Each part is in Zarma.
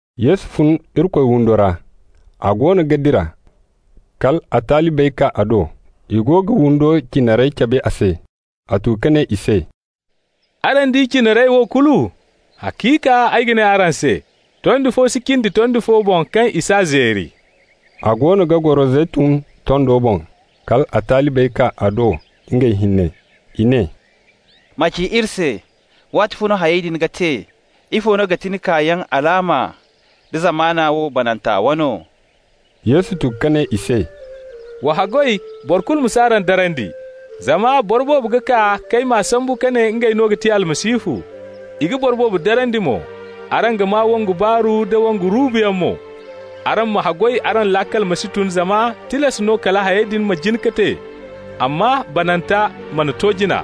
Yesu fun Irikoy windo ra. A goono ga dira, kal a talibey kaa a do. I go ga windo cinarey cabe a se. A tu ka ne i se: «Araŋ di cinarey wo kulu? Haciika ay ga ne araŋ se: tondi fo si cindi tondi fo boŋ kaŋ i s'a zeeri.» A goono ga goro Zeytun tondo boŋ kal a talibey kaa a do ngey hinne. I ne: «Ma ci iri se, waatifo no hayey din ga te? Ifo no ga ti ni kaayaŋ alaama, da zamana wo bananta wano?» Yesu tu ka ne i se: «Wa haggoy boro kulu ma si araŋ darandi. Zama boro boobo ga kaa k'ay maa sambu ka ne ngey no ga ti Almasihu. I ga boro boobo darandi mo. Araŋ ga maa wongu baaru da wongu ruubuyaŋ mo. Araŋ ma haggoy araŋ laakal ma si tun zama tilas no kala hayey din ma jin ka te, amma bananta mana to jina.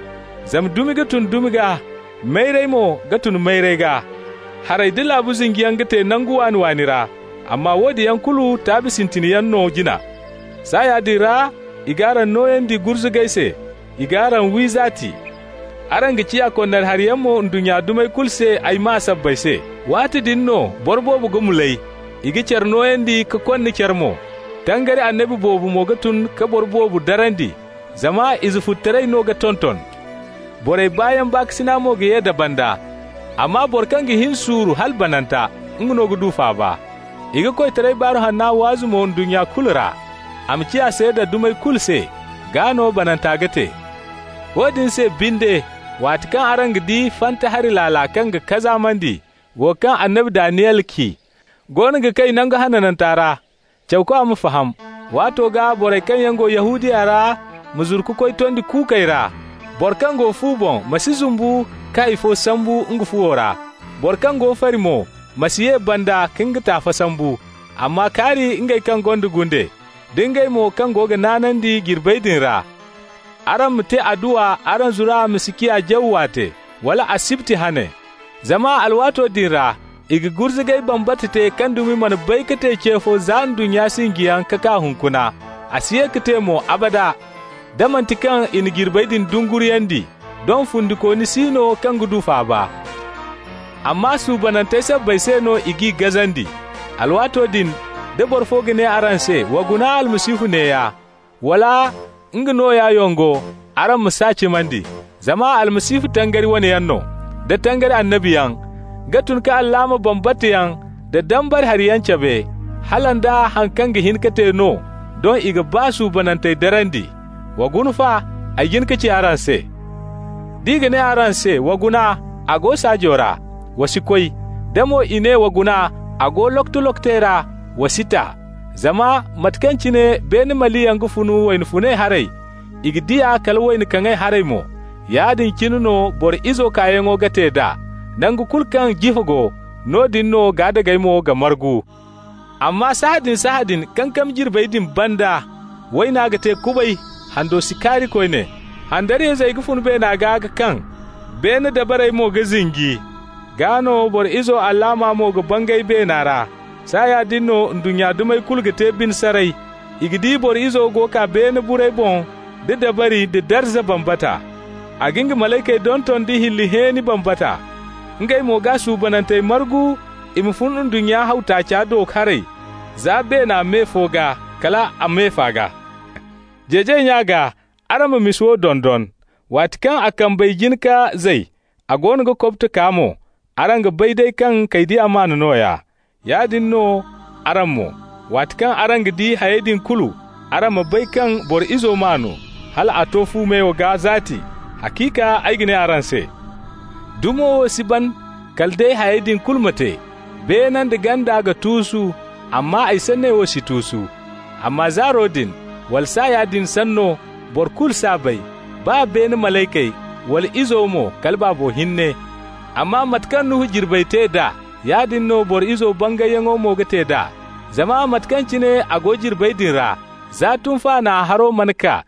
Zama dumi ga tun dumi gaa, mayray mo ga tun mayray gaa. Haray da laabu zinjiyaŋ ga te nangu waani-waani ra. Amma woodin yaŋ kulu taabi sintin yaŋ no jina. Saaya din ra i g'araŋ nooyandi gurzugay se, i g'araŋ wi, zaati. Araŋ ga ciya konnari hariyaŋ mo ndunnya dumey kulu se ay maa sabbay se. Waati din no boro boobo ga mulay, i ga care nooyandi ka konna care mo. Tangari annabi boobo mo ga tun ka boro boobo darandi. Zama izefututaray no ga tonton, borey baayaŋ baakasina mo ga ye da banda. Amma boro kaŋ ga hin suuru hala bananta, nga no ga du faaba. I ga koytara Baaru Hanna waazu mo ndunnya kulu ra, a ma ciya seeda dumey kulu se. Gaa no bananta ga te. Woodin se binde, waati kaŋ araŋ ga di ‹fanta hari laala kaŋ ga kazaamandi,› wo kaŋ annabi Daniyel ci, goono ga kay Nangu Hananta ra (cawkwa ma faham), waato gaa borey kaŋ yaŋ go Yahudiya ra ma zuru ka koy tondey kuukey ra. Boro kaŋ go fu boŋ ma si zumbu ka hay fo sambu nga fuwo ra. Boro kaŋ go fari mo ma si ye banda ka nga taafa sambu. Amma kaari ngey kaŋ gonda gunde, da ngey mo kaŋ go ga naanandi jirbey din ra! Araŋ ma te adduwa araŋ zura ma si ciya jaw waate, wala asibti hane. Zama alwaato din ra i ga gurzugay bambata te kaŋ dumi mana bay ka te ce fo za ndunnya sinjiyaŋ ka kaa hunkuna, a si ye ka te mo abada. Da manti kaŋ i na jirbey din dunguriyandi, doŋ fundikooni si no kaŋ ga du faaba. Amma suubanantey sabbay se no i g'i gazandi. Alwaato din da boro fo ga ne araŋ se: ‹Wa guna, Almasihu neeya!› wala, ‹Nga nooya yongo!› araŋ ma s'a cimandi. Zama almasihu, tangari wane yaŋ, da tangari annabiyaŋ, ga tun ka alaama bambata yaŋ da dambara hariyaŋ cabe, hala nda haŋ kaŋ ga hin ka te no, doŋ i ga baa suubanantey darandi. Wa guna fa, ay jin ka ci araŋ se. D'i ga ne araŋ se: ‹Wa guna, a go saajo ra!› wa si koy. Da mo i ne: ‹Wa guna, a go lokoto-lokotey ra!› wa si ta. Zama mate kaŋ cine beene maliyaŋ ga fun wayna funay haray, i ga di a kala wayna kaŋay haray mo, yaadin cine no Boro Izo kaayaŋo ga te d'a. Nangu kulu kaŋ jifa go, noodin no gaadagey mo ga margu. Amma sahãadin-sahãadin kankami jirbey din banda, ‹wayna ga te kubay, hando si kaari koyne, handariyayzey ga fun beena gaa ka kaŋ, beene dabarey mo ga zinji.› Gaa no Boro Izo alaama mo ga bangay beena ra. Saaya din no ndunnya dumey kulu ga te bine saray. I ga di Boro Izo go kaa beene burey boŋ da dabari da darza bambata. A ga nga malaykey donton da hilli hẽeni bambata, ngey mo g'a suubanantey margu i ma fun ndunnya haw taaca do haray za beena me fo gaa kal a me fa gaa. Jeejay nya gaa araŋ ma misa wo dondon. Waati kaŋ a kambey jin ka zay, a goono ga kobto kaa mo, araŋ ga bay day kaŋ kaydiya maan nooya. Yaadin no araŋ mo: waati kaŋ araŋ ga di hayey din kulu, araŋ ma bay kaŋ Boro Izo maanu, hal a to fu meyo gaa zaati. Haciika ay ga ne araŋ se: dumo wo si ban kala day hayey din kulu ma te. Beene nda ganda ga tuusu, amma ay sanney wo si tuusu. Amma zaaro din, wala saaya din sanno, boro kulu s'a bay, baa beene malaykey, wala Izo mo, kala Baabo hinne. Amma mate kaŋ Nuhu jirbey te d'a, yaadin no Boro Izo bangayyaŋo mo ga te d'a. Zama mate kaŋ cine a go jirbey din ra, za tunfaana haro mana kaa,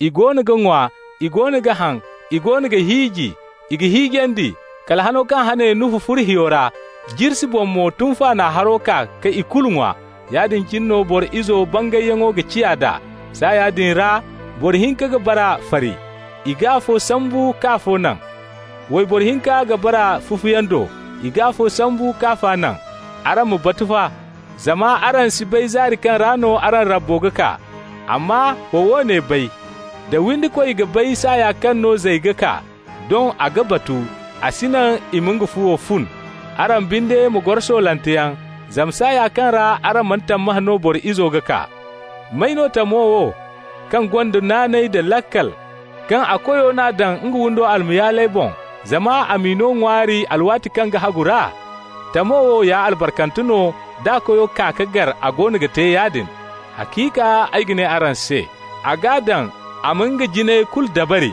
i goono ga ŋwa, i goono ga haŋ, i goono ga hiiji, i ga hiijandi, kala hano kaŋ hane Nuhu furo hiyo ra, jirsi boŋ mo tunfaana haro kaa ka ikulu ŋwa. Yaadin cine no Boro Izo bangayyaŋo ga ciya d'a. Saaya din ra boro hinka ga bara fari. I g'afo sambu k'afa naŋ. Wayboro hinka ga bara fufuyaŋ do. I g'afo sambu k'afa naŋ. Araŋ ma batu fa, zama araŋ si bay zaari kaŋ ra no araŋ Rabbo ga kaa. Amma ma woone bay: da windikoy ga bay saaya kaŋ no zay ga kaa, doŋ a ga batu, a si naŋ i ma nga fuwo fun. Araŋ binde ma goro soolanteyaŋ, zama saaya kaŋ ra araŋ mana tammahã no Boro Izo ga kaa. May no tamo wo kaŋ gonda naanay da laakal, kaŋ a koyo n'a daŋ nga windo almayaaley boŋ, zama a m'i no ŋwaari alwaati kaŋ ga hagu ra? Tamo wo ya albarkante no d'a koyo kaa ka gar a goono ga te yaadin. Haciika ay ga ne araŋ se: a g'a daŋ a ma nga jinayey kulu dabari.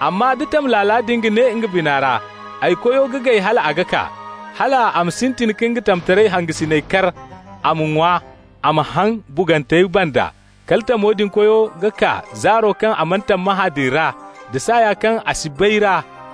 Amma da tam laala din ga ne nga bina ra: ‹Ay koyo ga gay hal a ga kaa,› hal a ma sintin ka nga tamtaray hangasiney kar, a ma ŋwa, a ma haŋ bugantey banda, kala tamo din koyo ga kaa zaaro kaŋ a mana tammahã din ra, da saaya kaŋ a si bay ra.